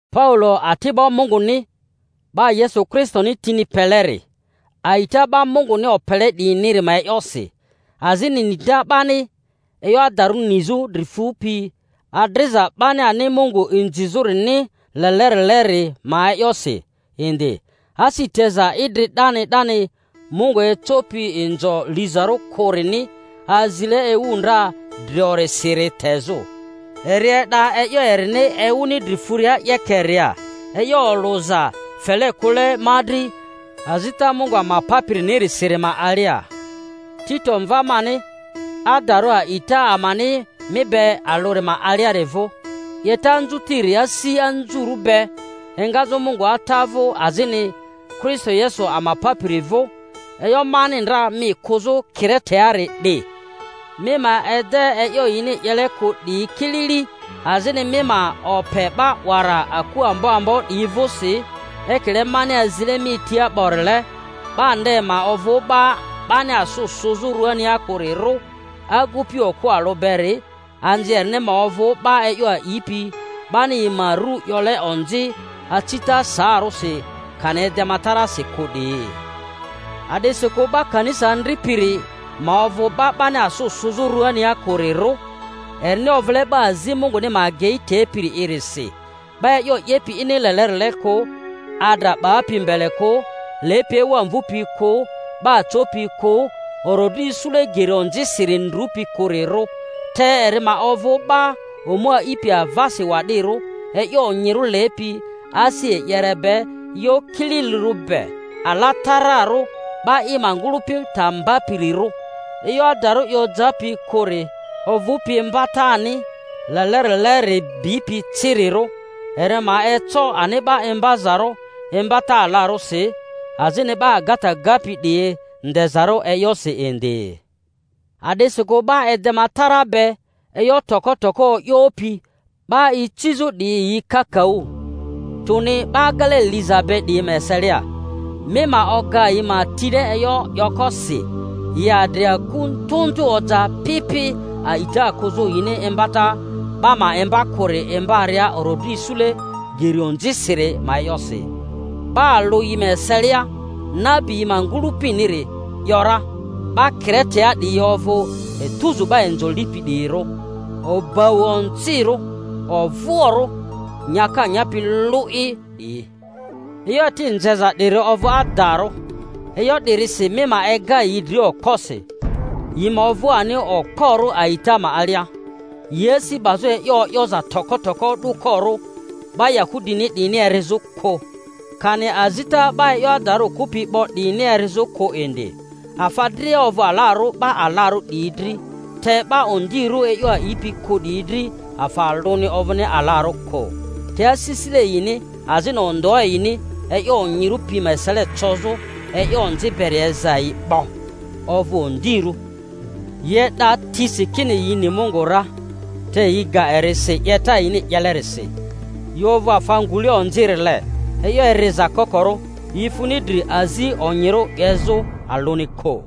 Paulo, ati'bo Munguni, 'ba Yesu Kristoni tini peleri, a'ita 'ba Munguni opele 'diyiniri ma e'yosi, azini nita 'bani e'yo adarᴜ nizᴜ dri fupi adriza 'bani ani Mungu inzizᴜri-ni lelerileri ma e'yosi indi, asi teza idri 'dani 'dani Mungu ecopi inzo lizarᴜ kᴜrini azile ewu ndra driorisiri tezᴜ; eri e'da e'yo erini ewuni dri furia 'yekeria, e'yo olᴜza fele kᴜle ma dri azita Mungu ama Papirinirisiri ma alia; Tito, mva mani adarᴜ a'ita ama-ni mi be alᴜri ma aliari vᴜ: 'Yeta anzutiri asi anzurᴜ be, engazᴜ Mungu Ata vᴜ azini Kristo Yesu ama Papiri vᴜ. E'yo mani ndra mi kᴜzᴜ Kire-teari 'di, mi ma ede e'yo yini 'yele kᴜ 'diyi kilili, azini mi ma ope 'ba 'wara aku ambo ambo 'diyi vᴜsi ekile mani azile mi tia 'borile; 'ba nde ma ovᴜ 'ba 'bani asᴜ sᴜzᴜ ruania kᴜrirᴜ, agupi okᴜ alᴜ beri, anzi erini ma ovᴜ 'ba e'yo a'ipi, 'bani yi ma ru 'yole onzi acita saarᴜsi kani edematarasi kᴜ 'diyi. A'disikᴜ 'ba kanisa andripiri ma ovᴜ 'ba 'bani asᴜ sᴜzᴜ ruania kᴜrirᴜ, erini ovᴜle 'ba azi Munguni ma agei tepiri'irisi; 'ba e'yo 'yepi ini lelerile kᴜ, adra 'bapi mbele kᴜ, lepi ewa mvupi kᴜ, 'ba copi kᴜ, orodri isule geri onzisiri ndrupi kᴜrirᴜ; te eri ma ovᴜ 'ba omu aipi avasi wa'dirᴜ, e'yo onyirᴜ lepi, asi e'yere be, e'yo kililirᴜ be, alatararᴜ, 'ba i ma ngᴜlᴜpi ta mbapirirᴜ; e'yo adarᴜ i ojapi kᴜri ovᴜpi imbatani lelerileri bipi cirirᴜ, eri ma eco ani 'ba imbazarᴜ imbata alarᴜsi, azini 'ba agata gapi 'diyi ndezarᴜ e'yosi indi. A'disikᴜ 'ba edema tara be, e'yo toko toko o'yopi 'ba icizᴜ 'diyi yi kakaᴜ, tᴜni 'ba agele liza be 'diyi ma eselia; mi ma oga yi ma tile e'yo 'yoko si, yi adri aku ndᴜ ndᴜ oja pi pi a'ita kᴜzᴜ yini imbata 'ba ma imba kᴜri imbaria orodri isule geri onzisiri ma e'yosi. 'Ba alᴜ yi ma eselia, nabi yi ma ngᴜlᴜpiniri, ‘yora, 'Ba Kiretea 'diyi ovᴜ etuzu 'ba inzo lipi 'diyirᴜ, obau onzirᴜ, ovᴜoᴜrᴜ nyaka nyapi lᴜ'i 'diyi. E'yo eti nzeza 'diri ovᴜ adarᴜ. E'yo 'dirisi mi ma ega yi dria okposi, yi ma ovᴜ ani okporᴜ a'ita ma alia, yi asi 'bazᴜ e'yo o'yoza toko toko o'dᴜkorᴜ 'ba Yahudini 'diyini erizᴜ kᴜ, kani azita 'ba e'yo adarᴜ kᴜpi 'bo 'diyini erizᴜ kᴜ indi. Afa dria ovᴜ alarᴜ 'ba alarᴜ 'diyi dri, te 'ba ondirᴜ e'yo a'ipi kᴜ 'diyi dri afa alᴜni ovᴜni alarᴜ kᴜ; te asisile yini azini ondᴜa yini e'yo onyirᴜ pi ma esele cozᴜ e'yo onzi beri eza yi 'bo, ovᴜ ondirᴜ. Yi e'da tisi kini yi ni Mungu ra, te yi ga eri si 'yeta yini 'yelerisi; yi ovᴜ afa ngule onzirile, e'yo eriza kokorᴜ, yi funi dri azi onyirᴜ 'yezᴜ alᴜni kᴜ.